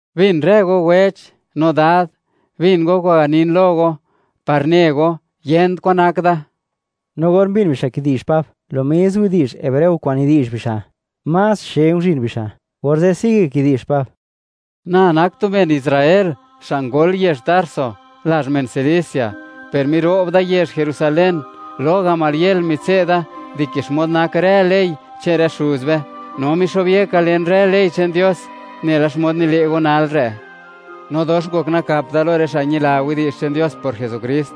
―Bin rë go wech, no dad, bin go kwa'n ganin lo go, par ne go, yent kwan nak da. No or mbin bixa' kidi'zh Pab lo mis widi'zh hebreo kwa'n nidi'zh bixa', más xe nguzhin bixa', orze' sigue kidi'zh Pab: ―Na nak tu men Israel xa' ngol yezh Tarso, lazh men Cilicia, per miro'b da yezh Jerusalén. Lo Gamaliel mitse'da dike xmod nak rë ley che'n rë xuz be, no mixo'byeka len rë ley che'n Dios, nela xmod nile' go nal re'. No dox ngok nakap da lo rë xa' ñila widi'zh che'n Dios por Jesukrist,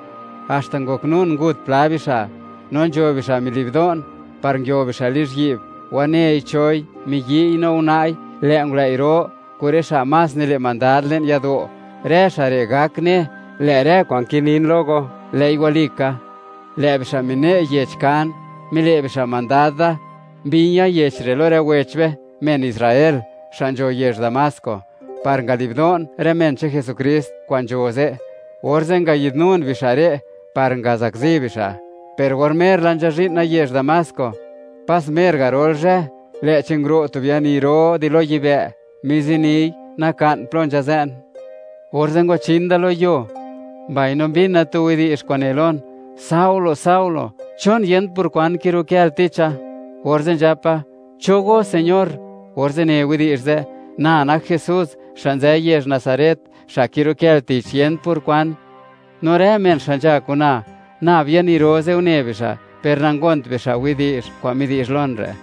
haxta ngoknun ngut pla bixa'. No nzho bixa' mili'bdo'n, par nguio bixa' lizhyi'b, wanei choi, miyi'y no una'i. Lë' ngulëi' ro, kun rë xa' más nile' mandad le'n yado', rë xa' re' gak ne, lë' rë kwa'n kinin lo go, lë'i walika. Lë' bixa' mine' yech kan, mile' bixa' mandad da, mbi̱ña̱ yech lo rë wech be, men Israel, xa' nzho yezh Damasco, par ngali'bdo'n rë men che'n Jesukrist kwa'n nzho ze', orze' ngayidnun bixa' re' par ngazakzi bixa'. ’Per or mer la nzhazhi'na yezh Damasco, pas mer garol zhë, lë'chi nguro' tu biani ro di lo yibë', miziniy naka'n plo nzhazë'n, orze' ngwachin da lo yuo, mbaino mbina tu widi'zh kwa'n ne lon: “¡Saulo, Saulo!, ¿chon yent por kwan kirukël ticha?” Orze' nzhapa: “¿Cho go, Señor?” Orze' ne widi'zh ze': “Na nak Jesús, xa' nzë yezh Nazaret, xa' kirukël tich, yent por kwan.” No rë men xa' nzha kun na, nab biani ro ze' une bixa', per nangont bixa' widi'zh kwa'n midi'zh lon re'.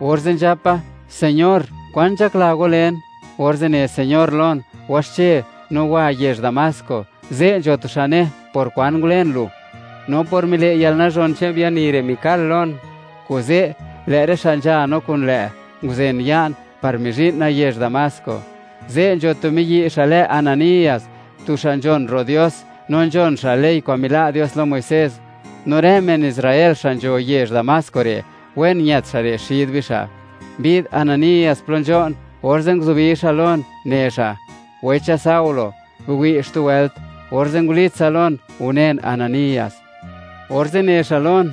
Orze' nzhapa: “Señor, ¿kwan nzhakla go len?” Orze' ne Señor lon: “Waxche no wa yezh Damasco. Ze' nzho tu xa' ne par kwan ngulen lu.” No por mile' yalnazhon che'n biani re' mikal lon, kuze' lë' rë xa' nzha no kun lë' nguzen ya'n, par mizhi'na yezh Damasco. ’Ze' nzho tu miyi' xa' lë Ananías, tu xa' nzhon ro' Dios, no nzhon xa' ley kwa'n mila' Dios lo Muisés. No rë men Israel xa' nzho yezh Damasco re', wen ñët xa' re' xid bixa'. Mbi'd Ananías plo nzho'n, orze' nguzubi xa' lon, ne xa': “¡Wecha Saulo!, biwi' xtu wëlt”, orze' ngulitsa lon, unen Ananías. Orze' ne xa' lon: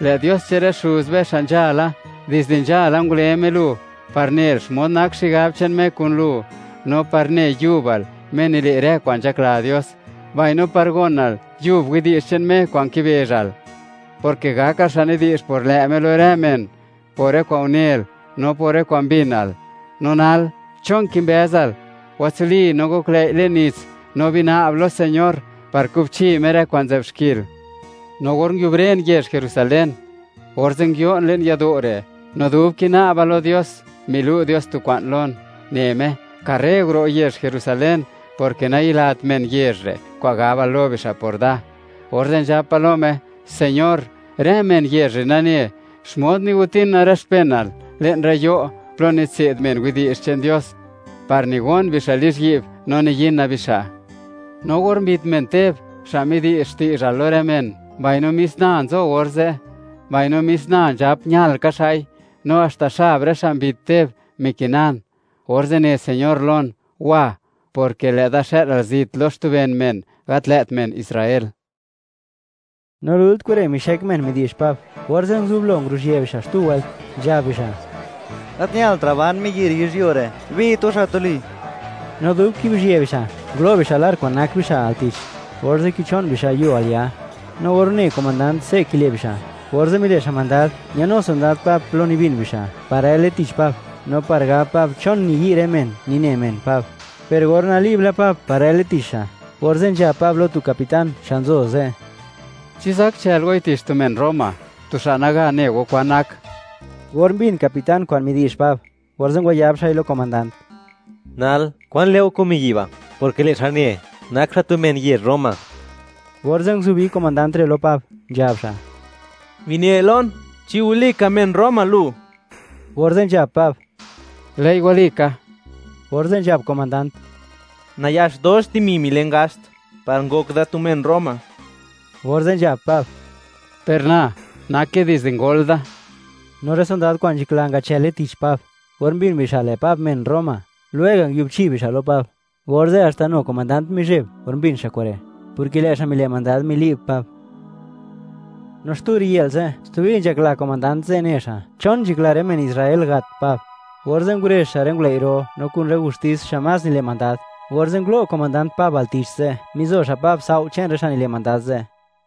“Lë' Dios che'n rë xuz be xa' nzhala, dizde nzhala ngule Me lu, par nel xmod nak xigab che'n Me kun lu, no par ne yubal Me nile' rë kwa'n nzhakla Dios; mbaino par gonal yub widi'zh che'n Me kwa'n kibezhal, porke gakal xa' nidi'zh por lë' Me lo rë men, por rë kwa'n unel, no por rë kwa'n mbinal. No nal, ¿chon kimbëzal? Watsuli, no goklëi' le'n nits, no bina'b lo Señor par kubchi Me rë kwa'n nzë'b xkil.” ’No or nguiubren yezh Jerusalén, orze' nguio'n le'n yado' re', no dub kina'ba lo Dios, milu' Dios tu kwa'n lon, ne Me: “¡Karre guro' yezh Jerusalén!, porke nayilat men yezh re' kwa'n gabal lo bixa' por da.” Orze' nzhapa lo Me: “Señor, rë men yezh re' nane, xmod nigotina rë xpenal le'n rë yo' plo nitse'd men widi'zh che'n Dios, par nigon bixa' lizhyi'b, no niyina bixa'. No or mbit men Teb xa' midi'zh xti'zhal lo rë men, mbaino mis na nzo orze', mbaino mis na nzhap ñal ka xa'i, no haxta xab rë xa' mbit Teb, mikinan.” Orze' ne Señor lon: “Wa, porke lë'da xë'lal zit lo xtu ben men, gat lë't men Israel.” No lult kure' mixek men midi'zh Pab, orze' nguzublo, ngurezhië bixa' xtu wëlt, nzhab bixa': ―¡Gat ñaltra' ban miyi' re' yizhyuo re'! ¡Bit go xa' tuli! No dub kibizhië bixa', ngulo' bixa' lar kwa'n nak bixa' al tich, orze' kicho'n bixa' yuo al ya. No or une komandant se' kile' bixa', orze' mile' xa' mandad, ñanu sondad Pab plo nibin bixa', par rële tich Pab, no par gab Pab chon niyi' rë men, nine men Pab. Per or nali'b la Pab par rële tich xa', orze' nzhab Pab lo tu capitán xa' nzo ze': ―¿Chi zak chël goi tich tu men Roma, tu xa' naga ne go kwan nak? Or mbin capitán kwa'n midi'zh Pab, orze' ngwayab xa'i lo komandant: ―Nal, ¿kwan le' go kun miyi' ba'?, porke lë' xa' ne, nak xa' tu men yezh Roma. Orze' nguzubi komandant re' lo Pab, nzhab xa': ―Bine lon, ¿chi walika, men Roma lu? Orze' nzhab Pab: ―Lë'i walika. Orze' nzhab komandant: ―Nayax dox dimi milen gaxt par ngok da tu men Roma. Orze' nzhab Pab: ―Per na, nake dizde ngol da. No rë sondad kwa'n nzhakla ngachële tich Pab, or mbin bixa', lë' Pab men Roma, lwega' nguibchi bixa' lo Pab; orze' haxta nu komandant mizheb or mbin xa' kure', porke lë' xa' mile' mandad mili'b Pab. No xtu riyë'l ze', stubi nzhakla komandant ze' ne xa', chon nzhakla rë men Israel, gat Pab. Orze' ngurezh xa' rë ngulëi' ro, no kun rë gustis xa' más nile' mandad, orze' ngulo' komandant Pab al tich ze', mizo xa' Pab tsao' che'n rë xa' nile' mandad ze'.